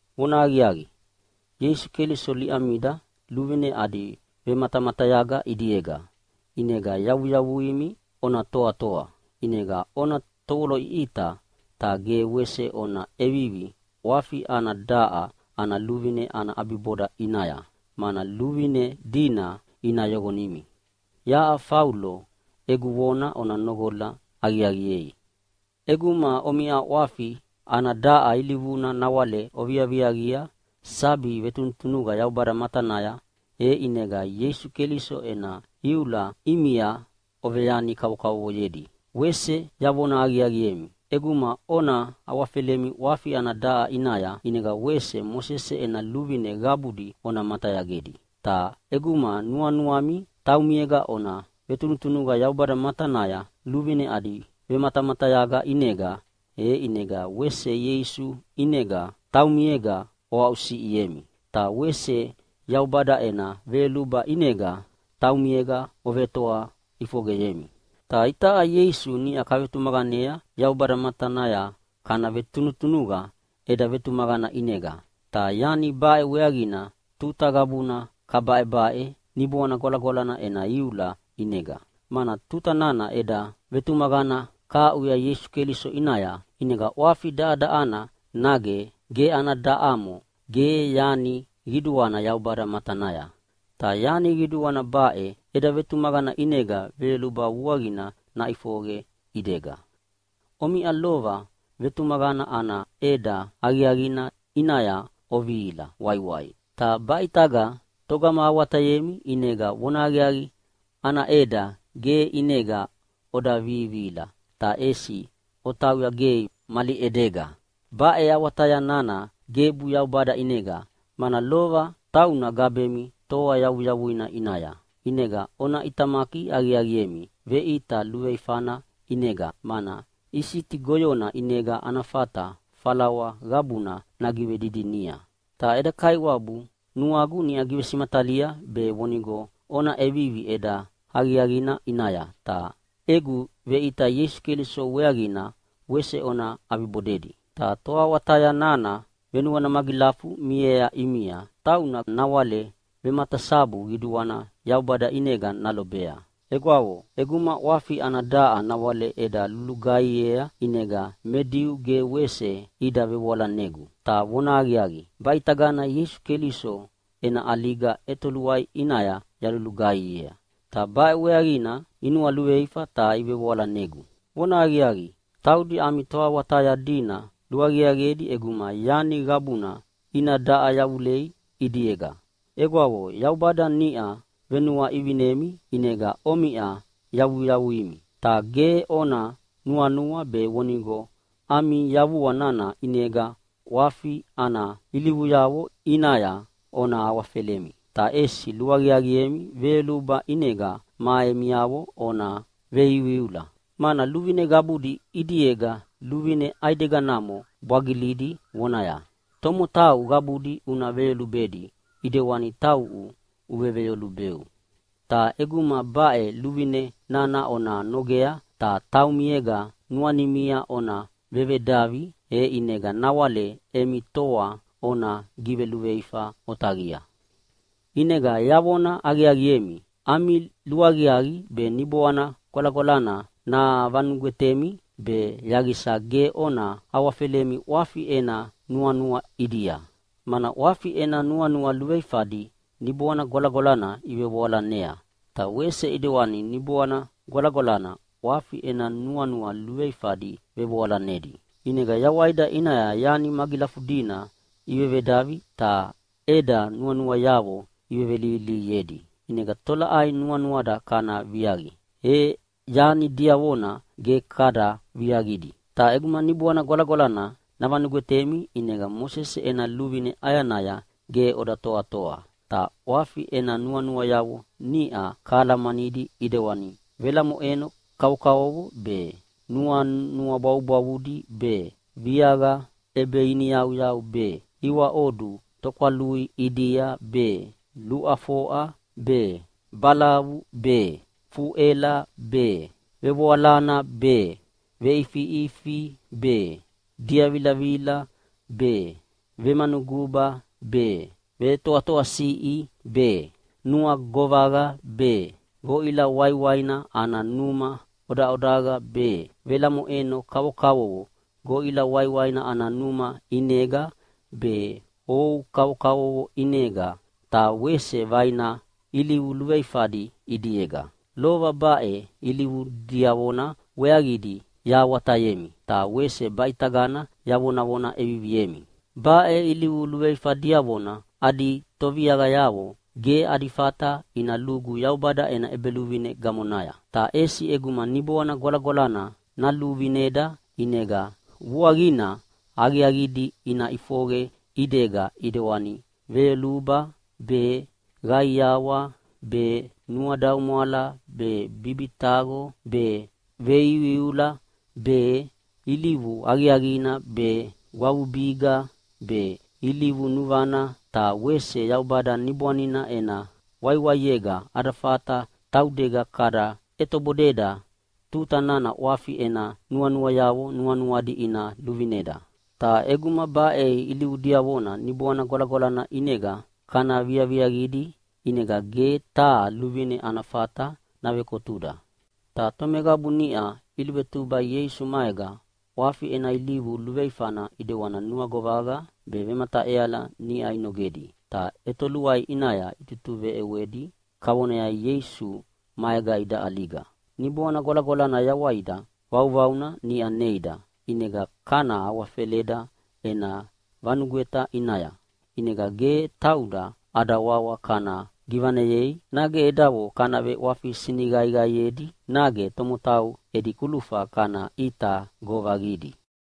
Vonahaqiaqi, Ieisu Keliso liʼamida luvine adi vematamatayaga ʼidiega, ʼinega yavuyavuimi ona toatoa. ʼInega ona tovoloʼiʼita, ta ge wese ona ʼevivi ʼwafi ana daʼa ana luvine ana ʼabiboda ʼinaya, mana luvine dina ina yoqonimi. Yaʼa Faulo egu vona ona noqola aqiaqiea! ʼEguma omiʼa ʼwafi ana daʼa ilivuna nawale oviaviaqia sabi vetunutunuqa Yaubada matanaya, e ʼinega Ieisu Keliso ena iula ʼimia oveyani kavokavovoyedi. Wese yavona aqiaqiemi, ʼeguma ona awafelemi ʼwafi ana daʼa ʼinaya, ʼinega wese Mosese ena luvine qabudi ona matayagedi. Ta ʼeguma nuanuami taumiega ona vetunutunuqa Yaubada matanaya luvine adi vematamatayaga ʼinega, e ʼinega wese Ieisu ʼinega taumiega oaʼusiʼiemi. Ta wese Yaubada ena veyoluba ʼinega taumiega ovetoa ʼifoqeyemi. Ta itaʼa Ieisu niʼa kavetumaqanea Yaubada matanaya kana vetunutunuqa eda vetumaqana ʼinega, ta yani baʼe weaqina tuta qabuna kabaʼebaʼe Niboana Gwalagwalana ena iula ʼinega. Mana tuta nana eda vetumaqana kahaʼuya Ieisu Keliso ʼinaya, ʼinega ʼwafi daʼadaʼana nage ge ana daʼamo ge yani qiduana Yaubada matanaya. Ta yani qiduana baʼe, eda vetumaqana ʼinega veyoluba vuaqina naʼifoqe ʼidega. Omiʼa lova vetumaqana ana ʼeda aqiaqina ʼinaya ovihila waiwai. Ta baʼe ʼitaga togama awatayemi ʼinega vonahaqiaqi ana ʼeda ge ʼinega oda vivihila, ta ʼesi otauya gei mali ʼedega. Baʼe awataya nana gebu Yaubada ʼinega, mana lova tauna gabemi toa yavuyavuina ʼinaya. ʼInega ona ʼitamaki aqiaqiemi veʼita luveifana ʼinega, mana isiti goyona ʼinega ana fata falawa qabuna nagivedidinia. Ta eda Kaiwabu nuagu niʼa givesimatalia be vonigo ona ʼevivi ʼeda aqiaqina ʼinaya, ta egu veʼita Ieisu Keliso weaqina wese ona ʼabibodedi. Ta toawataya nana venuana magilafu miea ʼimia tauna nawale vematasabu qiduana Yaubada ʼinega nalobea. Egwavo, ʼeguma ʼwafi ana daʼa nawale eda lulugaihiea ʼinega me Diu ge wese ida vevoalanegu. Ta vonahaqiaqi, baʼitagana Ieisu Keliso ena ʼaliga ʼetoluai ʼinaya yalulugaihiea, ta baʼe weaqina inualuveifa ta ivevoalanegu. Vonahaqiaqi, taudi ami toawataya dina luaqiaqiedi ʼeguma yani qabuna ina daʼa yavulei ʼidiega. Egwavo, Yaubada niʼa venuaʼivinemi ʼinega omiʼa yavuyavuimi. Ta ge ona nuanua be vonigo ami yavua nana ʼinega ʼwafi ana ilivuyavo ʼinaya ona awafelemi. Ta ʼesi luaqiaqiemi veyoluba ʼinega ma emiavo ona veiuiula. Mana luvine qabudi ʼidiega luvine ʼaideganamo bwagilidi vonaya, “Tomotau qabudi una veyolubedi ʼidewani tauʼu uveveyolubeu.” Ta ʼeguma baʼe luvine nana ona nogea ta taumiega nuanimia ona vevedavi, e ʼinega nawale emi toa ona giveluveifa otaqia. ʼInega yavona aqiaqiemi, ami luaqiaqi be Niboana Gwalagwalana navanugwetemi, be yaqisa ge ona awafelemi ʼwafi ena nuanua ʼidia. Mana ʼwafi ena nuanua luveifadi Niboana Gwalagwalana ivevoalanea, ta wese ʼidewana Niboana Gwalagwalana ʼwafi ena nuanua luveifadi vevoalanedi. ʼInega yawaida ʼinaya yani magilafudina ivevedavi ta eda nuanuayavo ivevelihilihiedi, ʼinega tolaʼai nuanuada kana viaqia, e yani diavona ge kada viaqidi. Ta ʼeguma Niboana Gwalagwalana navanugwetemi ʼinega Mosese ena luvine ʼayanaya ge oda toatoa. Ta ʼwafi ena nuanuayavo niʼa kahalamanidi ʼidewani velamoʼeno kavokavovo be, nuanua bwavubwavudi be, viaqa ʼebeiniyauyau be, iwaʼodu tokwalui ʼidia be, luʼafoʼa be, balavu be, fuʼela be, vevoalana be, veʼifiʼifi be, diavilavila be, vemanuguba be, vetoatoasiʼi be, nuagovaqa be, goʼila waiwaina ana numa ʼodaʼodaqa be, velamoʼeno kavokavovo goʼila waiwaina ana numa ʼinega be ou kavokavovo ʼinega, ta wese vaina ilivu luveifadi ʼidiega. Lova baʼe ilivu diavona weaqidi yahawatayemi, ta wese baʼitagana yavonavona ʼeviviemi: Baʼe ilivu luveifa diavona adi toviaqayavo ge adi fata ina lugu Yaubada ena ʼEbeluvine gamonaya. Ta ʼesi ʼeguma Niboana Gwalagwalana naluvineda ʼinega vuaqina aqiaqidi ina ʼifoqe ʼidega ʼidewani, veyoluba be, qaiawa be, nuadaumwala be, bibitaqo be, veiuiula be, ilivu aqiaqina be, gwavubiga be, ilivu nuvana, ta wese Yaubada Niboanina ena waiwaiega ada fata taudega kada ʼetobodeda tuta nana ʼwafi ena nuanuayavo nuanuadi ina luvineda. Ta ʼeguma baʼe ilivu diavona Niboana Gwalagwalana ʼinega kana viaviaqidi ʼinega ge taha luvine ana fata navekotuda. Ta tomeqabu niʼa iluvetuba Ieisu maega ʼwafi ena ilivu luveifana ʼidewani nuagovaqa be vemataʼeala niʼa inogedi, ta ʼetoluai ʼinaya itutuveʼewedi kavonaya Ieisu maega ida ʼaliga. Niboana Gwalagwalana yawaida vauvauna niʼa neida, ʼinega kana awafeleda ena vanugweta ʼinaya. ʼInega ge tauda ada wawa kana givaneyei, nage edavo kana veʼwafi siniqaiqaiedi, nage tomotau edi kulufa kana ʼita govaqidi.